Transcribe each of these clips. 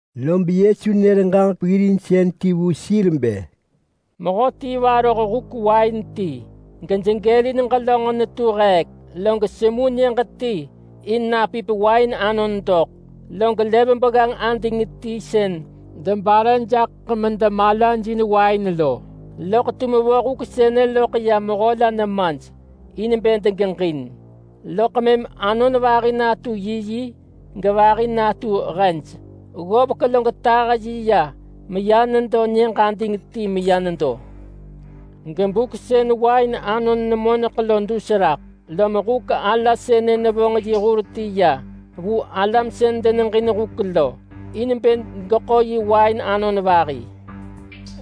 Lob Yesu nër ġaġek peggirinsën ti vu sir bë, “Mehöti varoh huk wain ti, gejegelin ġelönġ netu heek, log semu nyëġ ti in napip wain anon doḳ. Log lev begganġ ading ti sën debare jaḳ medemalajin wain lo. Loḳ tum vo huk sënë loḳ ya mehö la nemaj in bë degeġin, loḳ mëm anon vahi natu yiyi gevahi natu hej. Ggovek log tah yi ya meya nyëġ ading ti meya nedo. Gebuk sën wain anon nemoneḳ lo dus raḳ, lob huk ala sënë nevonġ yi hur ti ya vu mehönon sën deneġin huk lo, in bë geḳo yi wain anon vahi.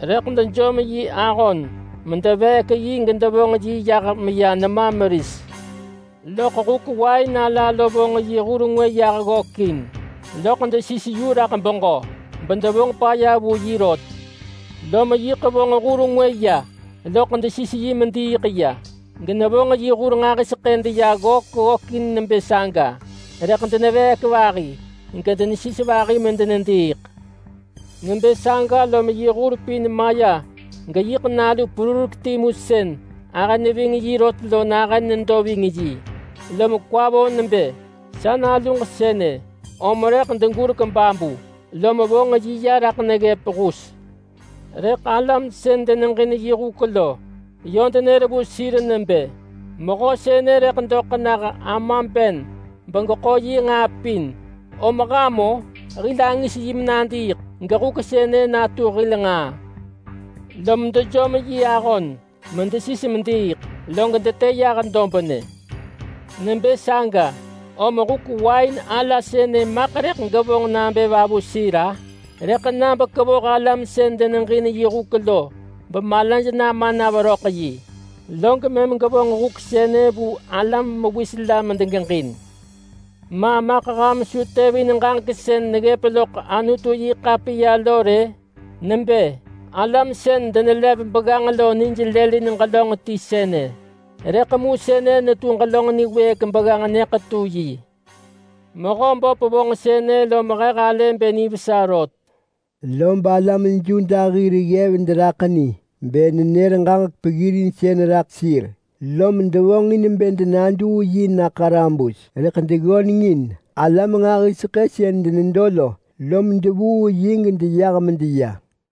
Rëḳ dejom yi ahon medeveek yi gedevonġ yi yah meya nema meris. Loḳ huk wain ala lo vonġ yi hur ngwë yah ggökin, loḳ desis yu raḳ beġö, bedevonġ paya vu yi rot. Lom yiḳ vonġ hur ngwë ya, loḳ desis yi mediiḳ ya; genevonġ yi hur nġahiseḳë deya ggök ggökin nebë saga, lob deneveek vahi, gedenesis vahi medenediiḳ. Nebë saga lob yi hur pin maya geyiḳ nalu perurek timu sën ahë neving yi rot lo nahën nedo ving yi. Lom kwa vo nebë, ‘Sa naluġ sënë, om rëḳ degurek babu!’ lom vonġ yi ya raḳ neggëp hus. Rëḳ alam sën deneġin yi huk lo, yö denër vu sir nebë, ‘Mehö sënë rëḳ doḳ nah ama ben begeḳo yi nġaa pin, om ham-o! Hil angis yi menadiiḳ gehuk sënë natu hil nġaa!’ Lom dejom yi ahon medesis mediiḳ, log detë yah dobnë. Nebë saga, om huk wain ala sënë maḳ rëḳ gevonġ nabë va vu sir-a? Rëḳ na bekevoh alam sën deneġin yi huk lo bemalaj nama na veröḳ yi, log mëm gevonġ huk sënë vu alam mewis la medegeġin. Ma maḳ ham su tevin ġaġek sën neggëp loḳ Anutu-yi-ḳapiya lo rë? Nebë: ‘Alam sën denelev begganġ lo nij lëlin ġelönġ ti sënë. Rëḳ mu sënë netu ġelönġ niwëëk begganġ nyëḳetu yi. Mehöböp vonġ sënë lom he halë bë nivesa rot!’” Lob alam Yuda hir ggev deraḳ ni bë nenër ġaġek peggirinsën raḳ sir, lom devonġ in bë denaduu yi na ḳarabus, rëḳ deggöneng in alam nġahiseḳë sën denedo lo, lom devuu yi gedeyah medeya.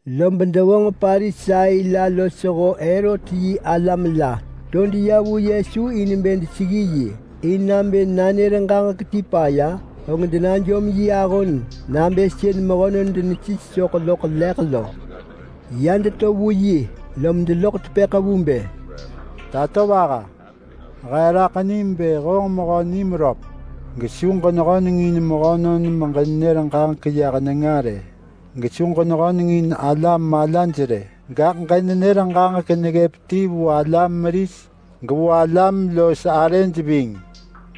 Lob devonġ Parisai la losho Herot yi alam la to deya vu Yesu in bë deseggi yi, in bë nabë nanër ġaġek ti paya, og denajom yi ahon nabë sën mehönon denesis soḳ loḳ leḳ lo. Ya deto vu yi lom deloḳ tepëḳ vu bë, “Tatovaha! He raḳ nim bë honġ mehö niröp, gesu ġenehöneng in mehönon meġenër ġaġek yah nenga rë! Gesu ġenehöneng in alam malaj rë, gaḳ ġenenër ġaġek neggëp ti vu alam meris gevu alam los arëj ving,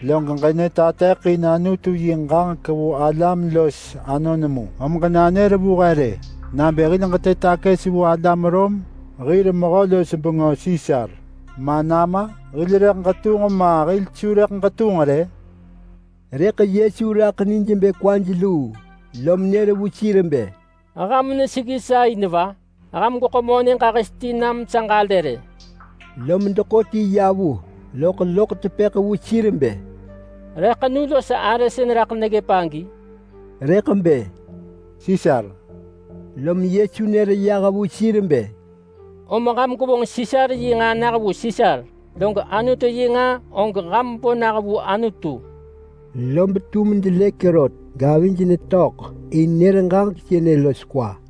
log ġenatateḳin Anutu yi ġaġek vu alam los anon mu. Om ġenanër vu he rë nabë hil ġetë takës na vu alam Rom hir mehö-los-bengö Sisar ma nama? Hil rëḳ ġetunġ ma hil su rëḳ ġetunġ rë?” Rëḳ Yesu raḳ nij bë kwaj luu, lom nër vu sir bë, “Ham neseggi sa in va? Ham gweḳo monë ġahis ti nam sa ġalë rë!” Lom deḳo ti ya vu, loḳ loḳ tepëḳ vu sir bë, “Re ḳenu los arë sën raḳ neggëp agi?” Rëḳ bë, “Sisar!” Lom Yesu nër vu sir bë, “Om ham gwevonġ Sisar yi nġaa nah vu Sisar, log Anutu yi nġaa og ham bo nah vu Anutu!” Lob tum delëk rot gavij netöḳ in nër ġaġek sënë los kwa.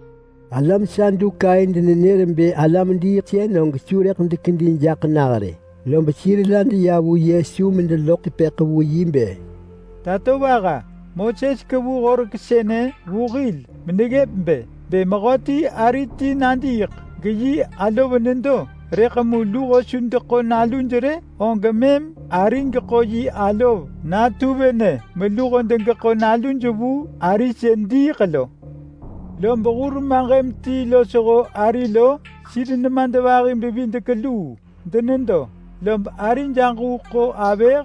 Alam Sadukai denenër bë alam-diiḳsën og su rëḳ dekedi jaḳ nah rë. Lob sir la deya vu Yesu medeloḳ tepëḳ vu yi bë, “Tatovaha! Moses kevu horek sënë vu hil meneggëp bë, ‘Bë mehöti ari ti nadiiḳ geyi alov nedo, rëḳ mu luho su deḳo naluj rë, og mëm ari geḳo yi alov natu venë meluho degeḳo naluj vu ari sën diiḳ lo’. Lob hur maġëm ti losho ari lo, sir nemadvahi-bevidek-luu denedo, lob arij aġuu ḳo avëh,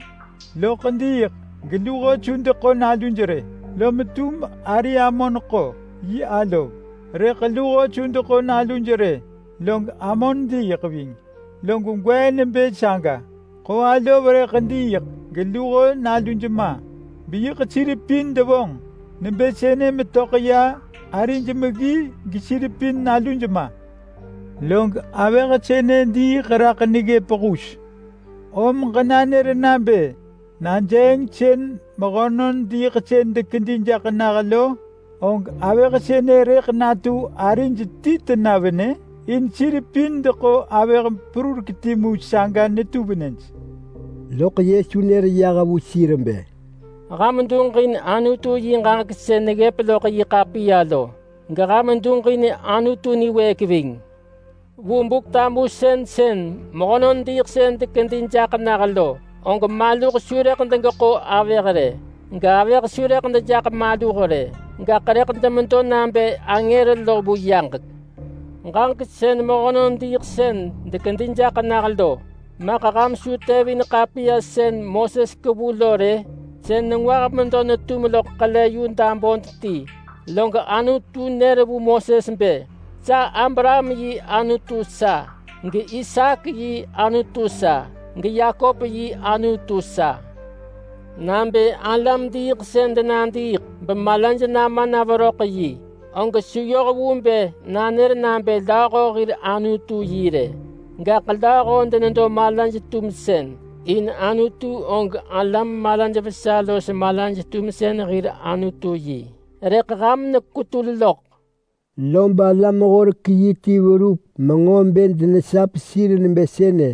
loḳ diiḳ geluho su deḳo naluj rë. Lom tum ari amon ḳo yi alov, rëḳ luho su deḳo naluj rë, log amon diiḳ ving. Log gwee nebë saga, ḳo alov rëḳ diiḳ geluho naluj ma. Beyiḳ sir pin devonġ nebë sënë metöḳ ya arij meggi, gesir pin naluj ma. Log avëh sënë diiḳ raḳ neggëp hus. Om ġenanër nabë najeeng sën mehönon diiḳsën dekedi jaḳ nah lo, og avëh sënë rëḳ natu arij ti tena venë? In sir pin deḳo avëh timu saga netu venëj.” Loḳ Yesu nër yah vu sir bë, “Ham duġin Anutu yi ġaġek sën neggëp loḳ yi ḳapiya lo, geham duġin Anutu niwëëk ving. Vu Buk-tamusën sën mehönon diiḳsën dekedi jaḳ nah lo, og maluh su rëḳ degeḳo avëh rë, gavëh su rëḳ dejaḳ maluh rë. Gaḳ rëḳ demedo nabë angër lo vu yaġek. Ġaġek sën mehönon diiḳsën dekedi jaḳ nah lo, maḳ ham su tevin ḳapiya sën Moses kevu lo rë? Sën nengwah medo netum loḳ ḳele yu dabun ti log Anutu nër vu Moses bë, ‘Sa Abraham yi Anutu sa, gIsaak yi Anutu sa, geYakop yi Anutu sa!’ Nabë alam-diiḳsën denadiiḳ bemalaj nama na veröḳ yi, og su yoh vu bë nanër nabë lööho hir Anutu yi rë. Gaḳ lööho denedo malaj-tumsën, in Anutu og alam malaj vesa los malaj-tumsën hir Anutu yi. Rëḳ ham nekwetul loḳ.” Lob alam-horek-yi ti verup menġo bë denesap sir nebë sënë,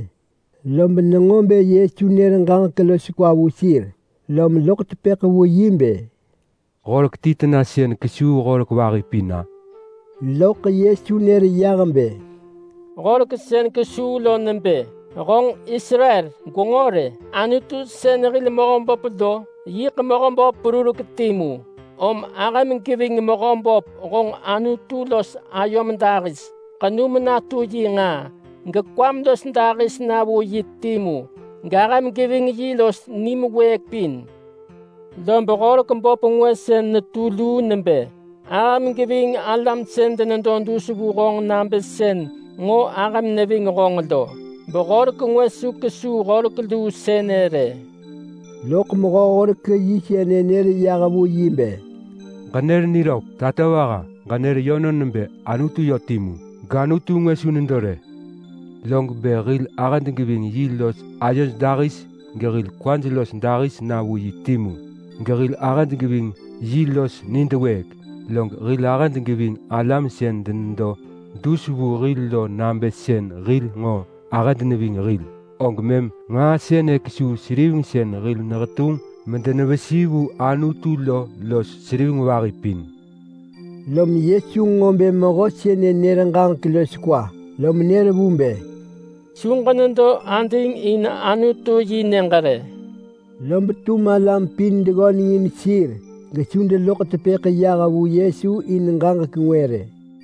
lob nenġo bë Yesu nër ġaġek los kwa vu sir lom loḳ tepëḳ vu yi bë, “Horek ti tena sën kesuu horek vahi pin-a?” Loḳ Yesu nër yah bë, “Horek sën kesuu lo nebë: Honġ Israel! Gwenġo rë! Anutu sën hil Mehöböp lo, yiḳ Mehöböp perurek timu, om ahëm geving Mehöböp honġ Anutu los ayom dahis. Ḳenum natu yi nġaa, gekwam los dahis na vu yi timu, gahëm geving yi los nim wëëk pin. Lob horek böp ngwë sën netu luu nebë: Ahëm geving alam sën denedo dus vu honġ nabë sën nġo ahëm neving honġ lo. Behorek ngwë su kesuu horek luu sënë rë!” Loḳ mehö-horek-yi sënë nër yah vu yi bë, “Ġenër niröp, tatovaha! Ġenër yönon nebë Anutu yö timu, gAnutu ngwë su nedo rë. Log bë hil ahëd geving yi los ayod dahis gehil kwad los dahis na vu yi timu, gehil ahëd geving yi los nid wëëk, log hil ahëd geving alam sën denedo dus vu hil lo nabë sën hil nġo ahëd neving hil, og mëm nġaa sënë kesuu seriveng sën hil nehetunġ medenevesi vu Anutu lo los seriveng vahi pin.” Lom Yesu nġo bë mehö sënë nër ġaġek los kwa lom nër vu bë, “Su ġenedo ading in Anutu-yi-nyëġ rë!” Lob tum alam pin deggöneng in sir gesu deloḳ tepëḳ yah vu Yesu in ġaġek ngwë rë.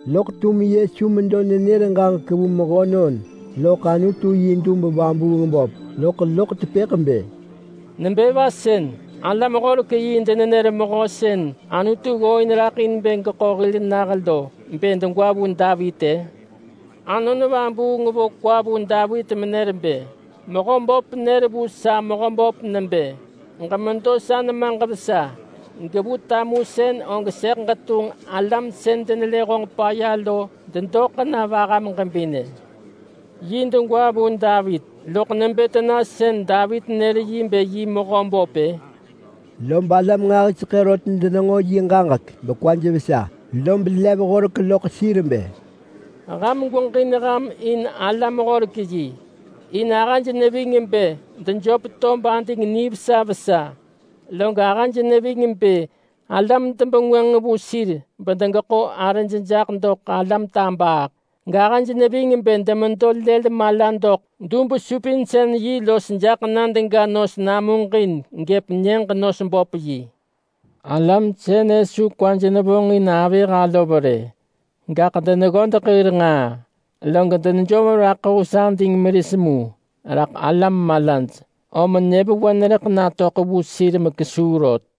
Loḳ tum Yesu medo nenër ġaġek vu mehönon loḳ Anutu yi dub-vabuung-böp, loḳ loḳ tepëḳ bë, “Nebë va sën alam-horek-yi denenër Mehö sën Anutu ggooin raḳ in bë geḳo hil nah lo bë degwa vu Davit-ë? Anon Vabuung vo kwa vu Davit menër bë: ‘Mehöböp nër vu sa Mehöböp nebë, “Ġemedo sa nemaġ vesa gevu tamusën og sëḳ ġetunġ alam sën denelë honġ paya lo dedoḳ na vaham ġebinë!” ’ Yi degwa vu Davit, loḳ nebë tena sën Davit nër yi bë yi Mehöböp-ë?” Lob alam nġahiseḳë rot denenġo yi ġaġek bekwaj vesa. Lob lev horek vu sir bë, “Ham gweġin ham in alam-horek-yi. In ahëj neving bë dejöp tob ading nivesa vesa, log ahëj neving bë alam debengwënġ vu sir bedegeḳo arëj jaḳ doḳ alam tabaaḳ, gahëj neving bë demedo lël mala doḳ dub-supinsën-yi los jaḳ na dega nos namuġin gëp nyëġ-nos-böp-yi. Alam sënë su kwaj nevonġin avëh alov rë, gaḳ deneggodeḳ hir nġaa, log denejom raḳ hus ading meris mu raḳ alam malaj. Om nyëvewen rëḳ natöḳ vu sir mekesuu rot.”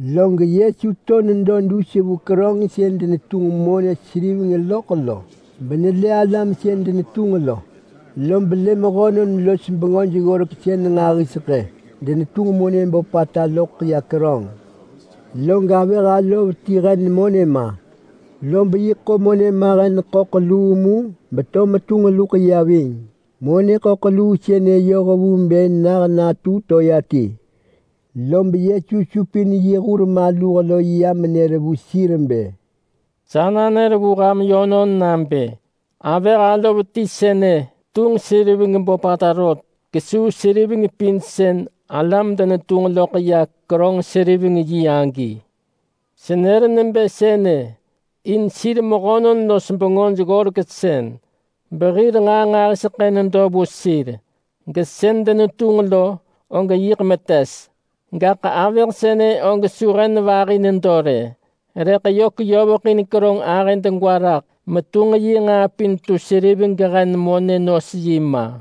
Log Yesu to nedo dus vu keröng sën denetunġ monë seriveng loḳ vu Anutu lo, benelë alam sën denetunġ lo. Lob lë mehönon los bengöj-ggoreksën nġahiseḳë gedenetunġ monë böpata loḳ ya keröng, log avëh alov ti hen monë ma, lob yiḳ ḳo monë mahen ḳöḳ luu mu beto metunġ luḳ ya ving. Monë ḳöḳ luu sënë yoh vu bë nah natu toea ti. Lob Yesu supin yi hur maluh lo ya menër vu sir bë, “Sa nanër vu ham yönon nabë: Avëh alov ti sënë tunġ seriveng böpata rot kesuu seriveng pin sën alam denetunġ loḳ ya keröng-seriveng-yi lo. Senër nebë sënë in sir mehönon los bengöj-ggoreksën behir nġaa nġahiseḳë nedo vu sir, gaḳ sën denetunġ lo og yiḳ metes. Gaḳ avëh sënë og su hen vahi nedo rë, rëḳ yö keyoveḳin keröng ahë degwa raḳ metunġ yi nġaa pin tu seriveng gehen monë nos yi ma.”